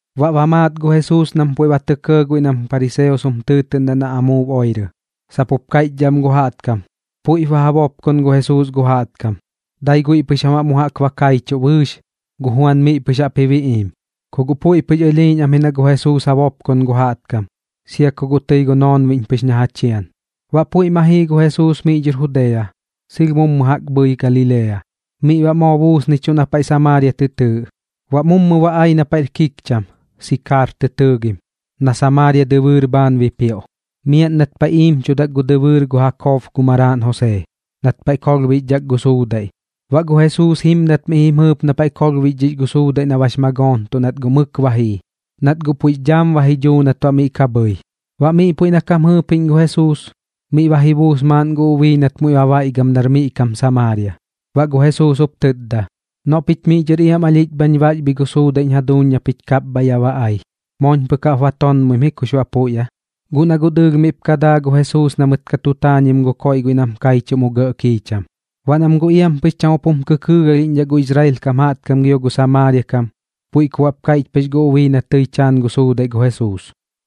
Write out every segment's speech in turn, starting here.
Baꞌ ba maat gu Jesuus nam puiꞌ ba tɇ kɇɇ guiꞌ nam pariseos jum tɨɨtɨꞌndaꞌ na amuub oirɨ, sap jup kaiꞌchdhaꞌ am gu jaꞌtkam: “Puiꞌp ba ja bopkon gu Jesuus gu jaꞌtkam, dai guiꞌ pɨx jam baꞌ mu jaꞌk ba kaichuꞌ bɨɨx, gu Juan miꞌ pɨx jaꞌp ji biꞌiim.” Ku guꞌ puiꞌ pɨx ɨlhiiꞌñ am ji na gu Jesuus ja bopkon gu jaꞌtkam, sia ku guꞌ tɨi gu noonbiꞌñ pɨx na ja chian. Baꞌ puiꞌ ma jii gu Jesuus miꞌ dhɨr Judea, sɨlh mummu jaꞌk bhɨi Galilea. Miꞌ baꞌ moo buusnichuꞌ na paiꞌ Samaaria tɨ tɨɨꞌ. Baꞌ mummu ba ai na paiꞌr kikcham, Sikaar tɨ tɨɨgim, na Samaaria dɨbɨɨr bhaan bipioꞌ, miaꞌn nat paiꞌ iimchudak gu dɨbɨɨr gu Jakob gu maraaꞌn Josee, nat paiꞌ kolhbixdhak gu suudaiꞌ. Baꞌ gu Jesuus jimdat mi jaꞌp jim jɨɨp na paiꞌ kolhbixdhix gu suudaiꞌ na bax magoontuꞌ nat guꞌ mɨk ba jii, nat guꞌ puiꞌx dhaam ba ji dhuu nat baꞌ miꞌ ka bhɨi. Baꞌ miꞌ puiꞌ na kam jɨɨpiꞌñ gu Jesuus, miꞌ ba ji buus maaꞌn gu ubii nat muiꞌ ba baiꞌgam nar miꞌ kam Samaaria. Baꞌ gu Jesuus jup tɨtda: ―Noꞌ pich miꞌ dhɨr iam alhiꞌch bhañ baxbhi gu suudaiꞌñ jaduuñ na pich kapbhaiꞌ yaꞌ ba ai. Mooñ pɨk jaꞌp ba tonmoim ji kux baꞌ puiꞌ aa. Guꞌ na guꞌ dɨɨlh miꞌp ka daa gu Jesuus na mɨt ka tu taanim gu koiꞌ guiꞌ nam kaichuꞌ mu gɇꞌ kiicham. Baꞌ nam guꞌ iam pɨx cham jum kɨkɨɨgalhiꞌñdhaꞌ gu Israel kam jaꞌtkam gio gu Samaaria kam, puiꞌ ku baꞌp kaiꞌch pɨx gu ubii na tɨi taan gu suudaiꞌ gu Jesuus: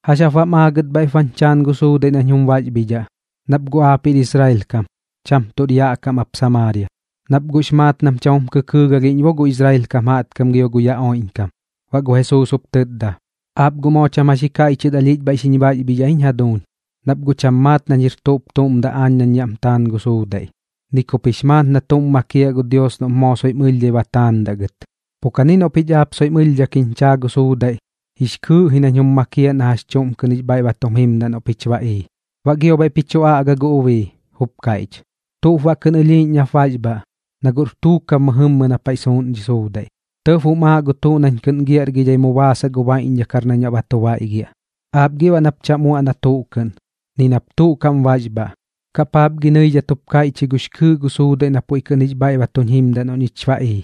―¿Jax jap baꞌm aagɨt bhaiꞌp bañ chaan gu suudaiꞌ nañ jum baxbhidhaꞌ? Nap guꞌ aap jir Israel kam, cham tuꞌr yaꞌ kam ap Samaaria. Nap guꞌx maat nam cham jum kɨkɨɨgalhiꞌñ bo gu Israel kam gio gu yaꞌ oiꞌñkam. Baꞌ gu Jesuus jup tɨtda: ―Aap guꞌ moo cham jax ji kaiꞌchɨt alhiꞌch xiñ baxbhidhaꞌ jiñ jaduuñ, nap guꞌ cham maat nañ jir tuꞌp tuꞌm daꞌ aañ nañ yaꞌm taan gu suudaiꞌ, ni kup jix maat na tuꞌm makiaꞌ gu Dios noꞌp moo soiꞌm ɨlhdhai ba taandaꞌ gɨt. Pu kani noꞌ pich aap soiꞌm ɨlhdhak jiñ chaa gu suudaiꞌ, jix kɨɨꞌ ji nañ jum makiaꞌ na jax chuꞌm kɨꞌn jix bhaiꞌ ba tum jimdaꞌ noꞌ pich ba ii. Baꞌ gio bhaiꞌ ji chu aꞌga gu ubii, jup kaiꞌch: ―¿Tuꞌp baꞌ kɨꞌn ɨlhiiꞌñ nap baxbhaꞌ, na guꞌr tuukab mɨjɨmmɨ na paiꞌ suuꞌn dhi suudaiꞌ? Tɇb jum aaꞌ gu tuꞌ nañ kɨꞌn giaꞌrgidhai mu baasaꞌ gu baiꞌñdhakar nañ baꞌ ba tu baiꞌgiaꞌ. Aap gi baꞌ nap cham uaꞌ na tuꞌ kɨꞌn, ni nap tuꞌ kaꞌm baxbhaꞌ. ¿Kaꞌ paap gi nɨidhat jup kaiꞌch ji gux kɨɨꞌ gu suudaiꞌ na puiꞌ kɨꞌn jix bhaiꞌ ba tuñ jimdaꞌ noꞌ ñich ba ii?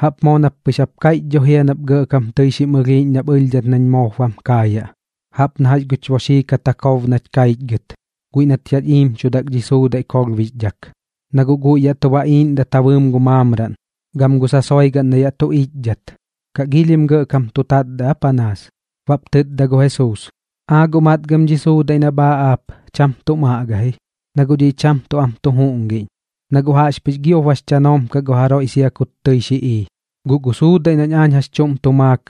Jaꞌp moo nap pɨx jap kaiꞌch dho jia nap gɇꞌkam tɨi xim ɨlhiiꞌñ nap ɨlhdhat nañ moop bam kaayaꞌ, jaꞌp na jax guch boxii kat Jakob nach kaichgɨt, guiꞌ nat yaꞌch iimchudak dhi suudaiꞌ kolhbixdhak. Na guꞌ guiꞌ yaꞌ tu baꞌiiꞌndat ja bɨɨm gu maamraꞌn, gam gu sasoigaꞌn na yaꞌ tu iꞌchdat. ¿Kaꞌ giilhim gɇꞌkam tu tatdaꞌ aa panaas? Baꞌp tɨtda gu Jesuus: ―Aa guꞌ matgam dhi suudaiꞌ nap aaꞌ aap, cham tuꞌm aꞌga ji, na guꞌ dhiꞌ cham tuꞌ am tu juꞌngiꞌñ, na guꞌ jaꞌxpɨx giop bax chanoom kaꞌ gu jaroiꞌ sia kut tɨi xi ii. Guꞌ gu suudaiꞌ nañ aañ jax chuꞌm tu maak,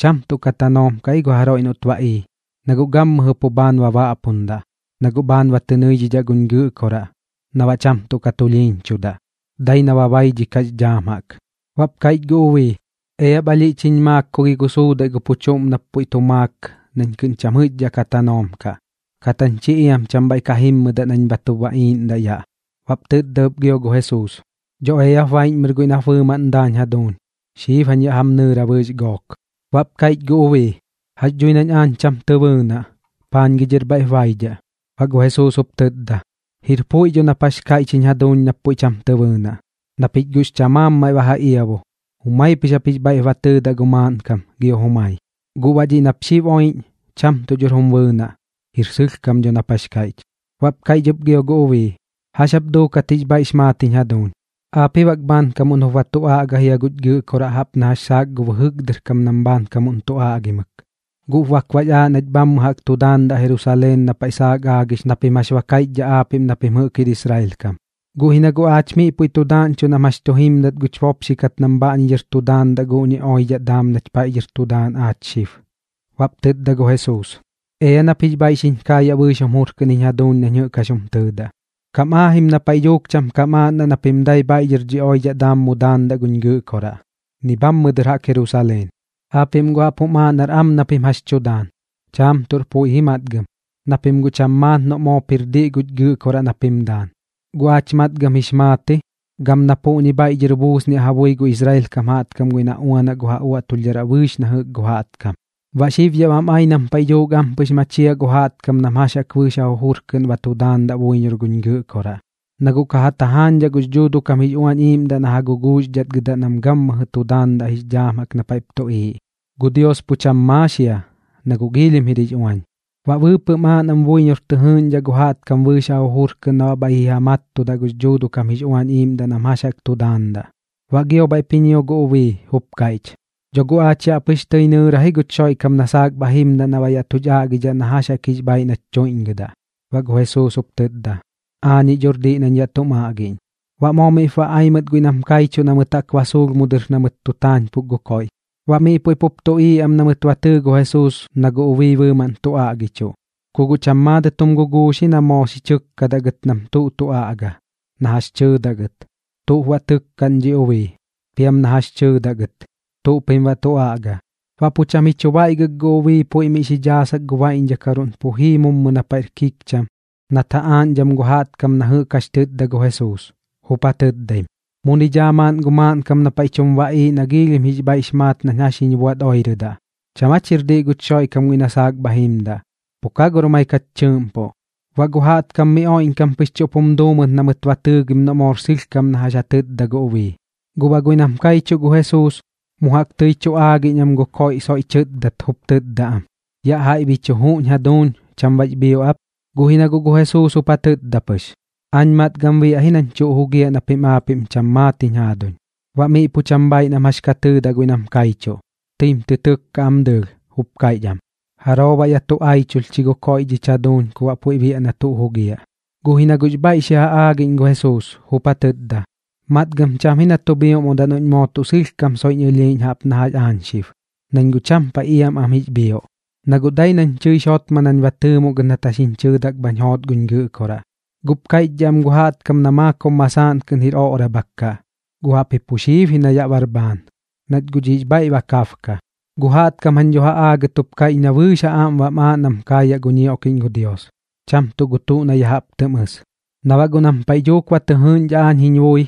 cham tuꞌ ka tanoom kaꞌ ji gu jaroiꞌ noꞌt ba ii, na guꞌ gammɨjɨ pu bhaan ba baꞌpundaꞌ, na guꞌ bhaan ba tɨ nɨidhidhaꞌ guñ Gɨꞌkoraꞌ na baꞌ cham tuꞌ ka tulhiiñchudaꞌ, dai na ba baidhikaꞌx dhaam jaꞌk. Baꞌp kaiꞌch gu ubii: ―Eap alhiꞌch jiñ maak ku gi gu suudaiꞌ gu pu chuꞌm nap puiꞌ tu maak nañ kɨꞌn cham jɨꞌxdhaꞌ ka tanoom kaꞌ, kat jañ chi iam cham bhaiꞌ ka jimmɨdaꞌ nañ bha tu baꞌiiꞌndaꞌ yaꞌ. Baꞌp tɨtda ɨp gio gu Jesuus: ―Dho eap baiꞌñmɨr guiꞌ nap bɨɨmaꞌn daañ jaduuñ. Xib jañ yaꞌ jam nɨɨra bɨɨx gook. Baꞌp kaiꞌch gu ubii: ―Jax dhui nañ aañ cham tɨ bɨɨnaꞌ. ¿Paañ gi dhɨr bhaiꞌp baidhaꞌ? Baꞌ gu Jesuus jup tɨtda: ―Jir puiꞌ dho nap jax kaiꞌch jiñ jaduuñ nap puiꞌ cham tɨ bɨɨnaꞌ. Na pich guꞌx chamaamim maiꞌ ba ja iabu, jumaip pɨx jix bhaiꞌp ba tɨɨdaꞌ gu maaꞌnkam gio jumai. Guꞌ baꞌ dhiꞌ nap xib oiꞌñ, cham tuꞌ dhor jum bɨɨnaꞌ. Jir sɨlhkam dho nap jax kaiꞌch. Baꞌp kaiꞌch ɨp gio gu ubii: ―¿Jax jap duukat jix bhaiꞌx maat jiñ jaduuñ? Aap ji bak bhaankamuꞌn jup ba tu aꞌga jia guch Gɨꞌkoraꞌ jaꞌp na jax saak gu bɨjɨk dɨr kam nam bhaankamuꞌn tu aꞌgimɨk. Guꞌp bak bax aaꞌ nach bhammɨ jaꞌk tu daandaꞌ Jerusaleen na paiꞌ saak aagix na pim jax ba kaiꞌchdhaꞌ aapiꞌm na pim jɨꞌk jir Israel kam. Guꞌ ji na guꞌ aach miꞌ puiꞌ tu daaꞌñchuꞌ nam jax tu jimdat guch bopxikat nam bhaꞌñi dhɨr tu daandaꞌ guꞌñi oidhaꞌ daam nach paiꞌ dhɨr tu daan aach xib. Baꞌp tɨtda gu Jesuus: ―Ea nap jix bhaiꞌ xiñ kaayaꞌ bɨɨx jum jur kɨꞌn jiñ jaduuñ nañ jɨꞌk jax jum tɨɨdaꞌ. Kam aajim na paiꞌ dhuuk cham kam aaꞌndaꞌ na pim dai bhaiꞌ dhɨr dhi oidhaꞌ daam mu daandaꞌ guñ Gɨꞌkoraꞌ, ni bhammɨ dɨr jaꞌk Jerusaleen. Aapiꞌm guꞌ jaꞌp jum aaꞌ nar am na pim jax tu daan. Chaam tuꞌr puiꞌ ji matgam, na pim guꞌ cham maat noꞌ moop jir diꞌ guñ Gɨꞌkoraꞌ na pim daan. Guꞌ aach matgam jix maat ji, gam na puꞌñi bhaiꞌ dhɨr buusniaꞌ ja bui gu Israel kam jaꞌtkam guiꞌ na uanaꞌ gu ja uaꞌtulhdharaꞌ bɨɨx na jɨꞌk jaꞌtkam. Baꞌ xib yaꞌ bam ai nam paiꞌ dhuuk ampɨx machiaꞌ gu jaꞌtkam nam jax jaꞌk bɨɨx ja jujur kɨꞌn ba tu daandaꞌ buiñor guñ Gɨꞌkoraꞌ, na guꞌ ka ja tajaañdhaꞌ gux Dhuuduꞌ kam jix Uañ Iiꞌmdaꞌ na ja guguuxdhatgɨdaꞌ nam gammɨjɨ tu daandaꞌ jix dhaam na paiꞌp tuꞌiiꞌ. Gu Dios pu cham maax jia, na guꞌ giilhim jir jix uañ. Baꞌ bɨɨpɨꞌm aaꞌ nam buiñor tɨ jɨɨꞌñdhaꞌ gu jaꞌtkam bɨɨx ja jujur kɨꞌn na baꞌ bhaiꞌ ji ja mattudaꞌ gux Dhuuduꞌ kam jix Uañ Iiꞌmdaꞌ nam jax jaꞌk tu daandaꞌ. Baꞌ gio bhaiꞌp ji ñio gu ubii, jup kaiꞌch: ―Dho guꞌ aach yaꞌ pɨx tɨi nɨɨra ji guch Xoiꞌkam na saak bha jimdaꞌ na baꞌ yaꞌ tuch aꞌgidhaꞌ na jax jaꞌk jix bhaiꞌ nach tuiꞌñgɨdaꞌ. Baꞌ gu Jesuus jup tɨtda: ―Aañiꞌ dhor diꞌ nañ yaꞌ tum aꞌgiꞌñ. Baꞌ moo miꞌp ba ai mɨt guiꞌ nam kaichuꞌ na mɨt jaꞌk ba suulh mu dɨr jaꞌk na mɨt tu taanpuk gu koiꞌ. Baꞌ miꞌ puiꞌ pup tuꞌiiꞌ am na mɨt ba tɨɨ gu Jesuus na gu ubii bɨɨmaꞌn tu aꞌgichuꞌ, ku guꞌ cham maadɨt jum guguux ji na moo xi chɨkkaꞌ gɨt nam tuꞌ tu aꞌga, na jax tɨɨdaꞌ gɨt: “¿Tuꞌp baꞌ tɨkkaꞌn dhi ubii?” Piam na jax tɨɨdaꞌ gɨt: “¿Tuꞌ pim baꞌ tu aꞌga?” Baꞌ pu cham ji chu baiꞌgɨk gu ubii puiꞌ mi jaꞌp xi dhaasak gu baiꞌñdhakaruꞌn pu jii mummu na paiꞌr kikcham nat ja aaꞌñdham gu jaꞌtkam na jɨꞌk jax tɨtda gu Jesuus, jup ja tɨtdaim: ―Muni dhaa maaꞌn gu maaꞌnkam na paiꞌ tum baꞌiiꞌ na giilhim bɨɨx jix bhaiꞌx maat nañ jax jiñ buaꞌt oirɨdaꞌ. ¿Cham aa chir diꞌ guch Xoiꞌkam guiꞌ na saak bha jimdaꞌ? Pu ka gor maik jach tɨɨꞌmpuꞌ. Baꞌ gu jaꞌtkam miꞌ oiꞌñkam pɨx chuꞌp jum duu mɨt na mɨt ba tɨɨgim noꞌ moor sɨlhkam na jax ja tɨtda gu ubii. Guꞌ baꞌ guiꞌ nam kaichuꞌ gu Jesuus, mu jaꞌk tɨi tu aagiꞌñ am gu koiꞌ soiꞌ tɨtdat jup tɨtda am: ―Yaꞌ jaiꞌ bi chu juꞌñ jaduuñ. ¿Cham bax bhioꞌ ap? Guꞌ ji na guꞌ gu Jesuus jup ja tɨtda pɨx: ―Aañ matgam biaꞌ ji nañ tuꞌ jugiaꞌ na pim aapiꞌm cham maat jiñ jaaduñ. Baꞌ miꞌ pu cham bhaaiꞌ nam jax ka tɨɨdaꞌ guiꞌ nam kaichuꞌ. Tɨim tɨ tɨkkaꞌ am dɨɨlh, jup kaiꞌch am: ―¿Jaroo baꞌ yaꞌ tu aichulh chi gu koiꞌ dhich jaduuñ ku baꞌ puiꞌ biaꞌ na tuꞌ jugiaꞌ? Guꞌ ji na guꞌx bhaiꞌ xi ja aagiꞌñ gu Jesuus, jup ja tɨtda: ―Matgam cham ji na tu bhioꞌmodaꞌ noꞌñ moo tuꞌ sɨlhkam soiꞌñ ɨlhiiꞌñ jaꞌp na jax aañ xib, nañ guꞌ cham paiꞌ iam pɨx am jix bhioꞌ, na guꞌ dai nañ tɨix jotma nañ ba tɨɨmoꞌ gɨt nat jax jiñ chɨɨdak bhañ joot guñ Gɨꞌkoraꞌ. Guꞌp kaiꞌchdhaꞌ am gu jaꞌtkam na maakob masaaꞌn kɨꞌn jir oꞌrabhak kaꞌ, guꞌ jaꞌpji pu xiib ji na yaꞌ bar bhaan, nat guꞌ dhiꞌx bhaiꞌ ba kabka. Gu jaꞌtkam jañ dho ja aagat jup kaiꞌch na bɨɨx ja aꞌm bam aaꞌ nam kaayaꞌ gu ñioꞌkiꞌñ gu Dios, cham tuꞌ gu tuꞌ na ya jaꞌp tɨm ɨs. Na baꞌ guꞌ nam paiꞌ dhuuk ba tɨ jɨɨꞌñdhaꞌ aañ jiñ bui,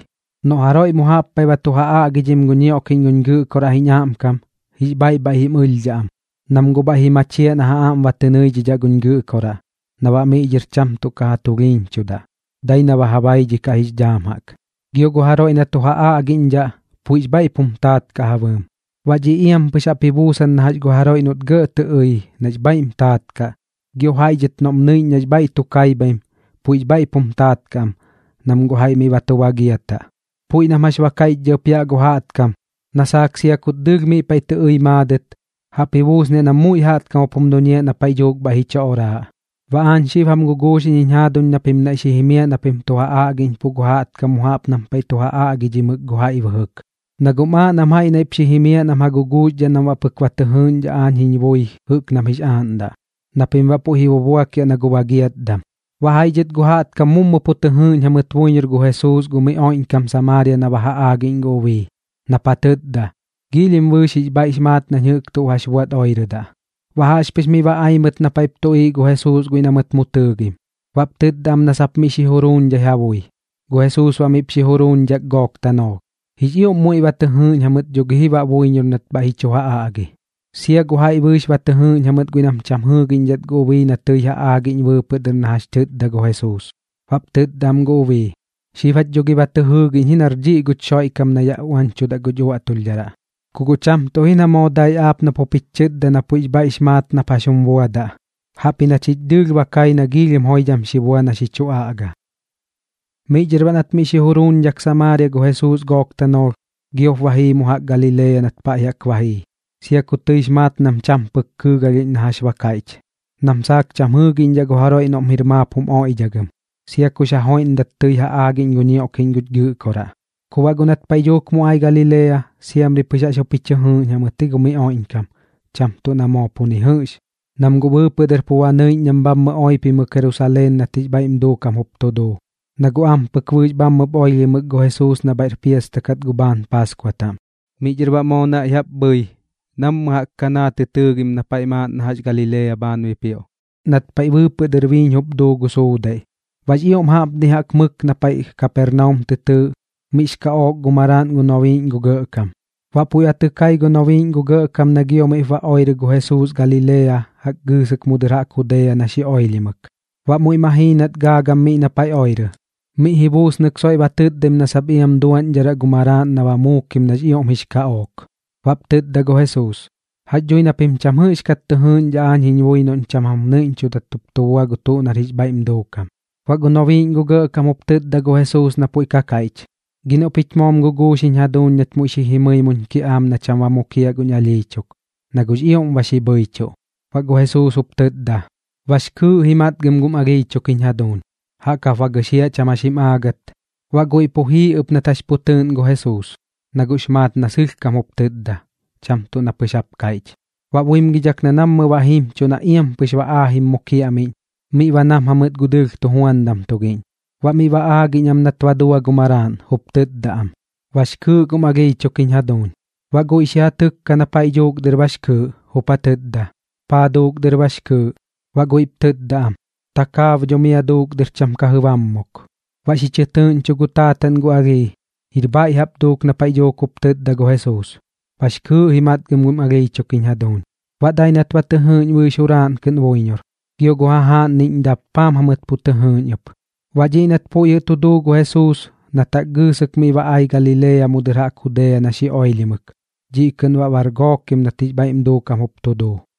noꞌ jaroiꞌ mu jaꞌp paiꞌ ba tu ja aꞌgidhim gu ñioꞌkiꞌñ guñ Gɨꞌkoraꞌ jiñ aꞌmkam, jix bhaiꞌ bhaiꞌ jim ɨlhdhaꞌ am, nam guꞌ bhaiꞌ ji machiaꞌ na ja aꞌm ba tɨ nɨidhidhaꞌ guñ Gɨꞌkoraꞌ na baꞌ miꞌ dhɨr cham tuꞌ ka ja tulhiiñchudaꞌ, dai na ba ja baidhikaꞌx dhaam jaꞌk. Gio gu jaroiꞌ na tu ja aꞌgiꞌñdhaꞌ, puiꞌx bhaiꞌp jum taat kaꞌ ja bɨɨm. Baꞌ dhiꞌ iam pɨx jaꞌp ji buusan na jax gu jaroiꞌ noꞌt gɇꞌ tɨ ɨi nax bhaiꞌm taat kaꞌ, gio jaiꞌ dhɨt noꞌm nɨiꞌñ nax bhaiꞌ tu kaibhaim, puiꞌx bhaiꞌp jum taat kaꞌ am, nam guꞌ jaiꞌ miꞌ ba tu bagiataꞌ. Puiꞌ nam jax ba kaiꞌchdhaꞌ ɨp yaꞌ gu jaꞌtkam, na saak sia kut dɨɨlh miꞌ paiꞌ tɨ ɨi maadɨt, jaꞌp ji buusniaꞌ nam muiꞌ jaꞌtkam jup jum duñiaꞌ na paiꞌ dhuuk bhaiꞌ ji chu oraaꞌ. Baꞌ aañ xib jam guguuxiꞌñ jiñ jaaduñ na pim naiꞌ xi jimiaꞌ na pim tu ja aꞌgiꞌñpuꞌ gu jaꞌtkam mu jaꞌp nam paiꞌ tu ja aꞌgidhimɨk gu jaiꞌ bɨjɨk. Na guꞌm aaꞌ nam jaiꞌ naiꞌp xi jimiaꞌ nam ja guguuxdhaꞌ nam baꞌ pɨk moo ba tɨ jɨɨꞌñdhaꞌ aañ jiñ bui jɨꞌk nam jix aaꞌndaꞌ, na pim baꞌ puiꞌ ji bubuakiaꞌ na gu bagiatdam. Baꞌ jaiꞌ dhɨt gu jaꞌtkam mummu pu tɨ jɨɨꞌñ jamɨt buiñor gu Jesuus gu miꞌ oiꞌñkam Samaaria na ba ja aagiꞌñ gu ubii, nap ja tɨtda: “Giilhim bɨɨx jix bhaiꞌx maat nañ jɨꞌk jax jiñ buaꞌt oirɨdaꞌ.” Baꞌ jaꞌxpɨx miꞌ ba ai mɨt na paiꞌp tuꞌiiꞌ gu Jesuus guiꞌ na mɨt mu tɨɨgim, baꞌp tɨtda am na sap miꞌ xi juruuñdhai ja bui. Gu Jesuus baꞌ miꞌp xi juruuñdhak gook tanoolh. Jix ioꞌm muiꞌ ba tɨ jɨɨꞌñ jamɨt dho gi ji baꞌ buiñor nat bhaiꞌ ji chu ja aꞌgi, sia gu jaiꞌ bɨɨx ba tɨ jɨɨꞌñ jamɨt guiꞌ nam cham jɨɨgiꞌñdhat gu ubii na tɨi ja aagiꞌñ bɨɨpɨꞌ dɨr na jax tɨtda gu Jesuus. Baꞌp tɨtda am gu ubii: ―Xib jach dho gi ba tɨ jɨɨgiꞌñ ji nar dhiꞌ guch Xoiꞌkam na yaꞌ uañchudaꞌ guch uaꞌtulhdharaꞌ. Ku guꞌ cham tuꞌ ji na moo dai aap nap jup jich chɨtda na puiꞌx bhaiꞌx maat nap jax jum buadaꞌ, jaꞌpji na chich dɨɨlh ba kai na giilhim joidham xi bua na xi chu aꞌga. Miꞌ dhɨr baꞌ nat miꞌ xi juruuñdhak Samaaria gu Jesuus gook tanoolh, giop ba jii mu jaꞌk Galilea nat pa jaꞌk ba jii, sia ku tɨix maat nam cham pɨk kɨɨgalhiꞌñ na jax ba kaiꞌch, nam saak cham jɨɨgiꞌñdhaꞌ gu jaroiꞌ noꞌm jir maap jum oiꞌdhagɨm, sia kux ja joiꞌndat tɨi ja aagiꞌñ gu ñioꞌkiꞌñ guch Gɨꞌkoraꞌ. Ku baꞌ guꞌ nat paiꞌ dhuuk mu ai Galilea, siamri pɨx jaꞌx jup ji chɨ jɨɨꞌn jamɨt ji gu miꞌ oiꞌñkam, cham tuꞌ na moo pu ni jɨꞌx, nam guꞌ bɨɨpɨꞌ dɨr pu ba nɨiꞌñ nam bhammɨ oipimɨk Jerusaleen nat jix bhaiꞌm duukam jup tu duu, na guꞌ ampɨk bɨɨx bhammɨp oilhimɨk gu Jesuus na bhaiꞌr piasta kat gu bhaan Paaskua taꞌm. Miꞌ dhɨr baꞌ moo naiꞌ jaꞌp bhɨi nammɨ jaꞌk Kanaa tɨ tɨɨgim na paiꞌ maaꞌn na jax Galilea bhaan bipioꞌ, nat paiꞌ bɨɨpɨꞌ dɨr biiñ jup duu gu suudaiꞌ. Baꞌx ioꞌm jaꞌpni jaꞌk mɨk na paiꞌ Kapernaum tɨ tɨɨꞌ, miꞌx kaꞌook gu maraaꞌn gu nobiiꞌñ gu gɇꞌkam. Baꞌ puiꞌ ba tɨ kai gu nobiiꞌñ gu gɇꞌkam na gio miꞌp ba oirɨ gu Jesuus Galilea jaꞌk gɨɨsɨk mu dɨr jaꞌk Judea na xi oilhimɨk. Baꞌ muiꞌ ma jii nat gaagam miꞌ na paiꞌ oirɨ, miꞌ ji buusnɨk soiꞌ ba tɨtdaim na sap iam duaꞌñdharaꞌ gu maraaꞌn na ba muukim nax ioꞌm jix kaꞌook. Baꞌp tɨtda gu Jesuus: ―Jax dhui na pim cham jɨꞌxkat tɨ jɨɨꞌñdhaꞌ aañ jiñ bui noꞌñ cham jam nɨiꞌñchudat jup tu bua gu tuꞌ nar jix bhaiꞌm duukam. Baꞌ gu nobiiꞌñ gu gɇꞌkam jup tɨtda gu Jesuus na puiꞌ ka kaiꞌch: ―Gi noꞌ pich moom guguux jiñ jaduuñ nach muiꞌ xi jimɨi muñ kiꞌaam na cham ba mukiaꞌ guñ alhii chuk, na guꞌx ioꞌm ba xi bhɨichuꞌ. Baꞌ gu Jesuus jup tɨtda: ―Bax kɨɨꞌ ji matgam gum alhii chuk jiñ jaduuñ. Jaꞌk jap ba gɨxiaꞌ cham jax jim aagɨt. Baꞌ guiꞌ pu jii ɨp nat jax pu tɨɨꞌn gu Jesuus, na guꞌx maat na sɨlhkam jup tɨtda, cham tuꞌ na pɨx jap kaiꞌch. Baꞌ buimgidhak na nammɨ ba jimchuꞌ na iam pɨx ba aajim mu kiaꞌmiꞌñ, miꞌ ba nam jamɨt gu dɨɨlh tujuandam tugiꞌñ, baꞌ miꞌ ba aagiꞌñ am nat ba dua gu maraaꞌn, jup tɨtda am: ―Bax kɨɨꞌ gum alhii chuk jiñ jaduuñ. Baꞌ guiꞌ xi ja tɨkka na paiꞌ dhuuk dɨr bax kɨɨꞌ, jup ja tɨtda: ―¿Paa duuk dɨr bax kɨɨꞌ? Baꞌ guiꞌp tɨtda am: ―Takaab dho mia duuk dɨr cham ka jɨbaamuk. Baꞌ xi chɨ tɨꞌñcho gu taataꞌn gu alhii, jir bhaiꞌ jaꞌp duuk na paiꞌ dhuuk jup tɨtda gu Jesuus: “Bax kɨɨꞌ ji matgam gum alhii chuk jiñ jaduuñ.” Baꞌ dai nat ba tɨ jɨɨꞌñ bɨɨx juraaꞌn kɨꞌn buiñor, gio gu jajaaꞌnniꞌñ dappaam jamɨt pu tɨ jɨɨꞌñ ɨp. Baꞌ dhiꞌ nat puiꞌ jɨꞌ tu duu gu Jesuus nat jaꞌk gɨɨsɨk miꞌ ba ai Galilea mu dɨr jaꞌk Judea na xi oilhimɨk, dhiꞌ kɨꞌn baꞌ bar gookim nat jix bhaiꞌm duukam jup tu duu.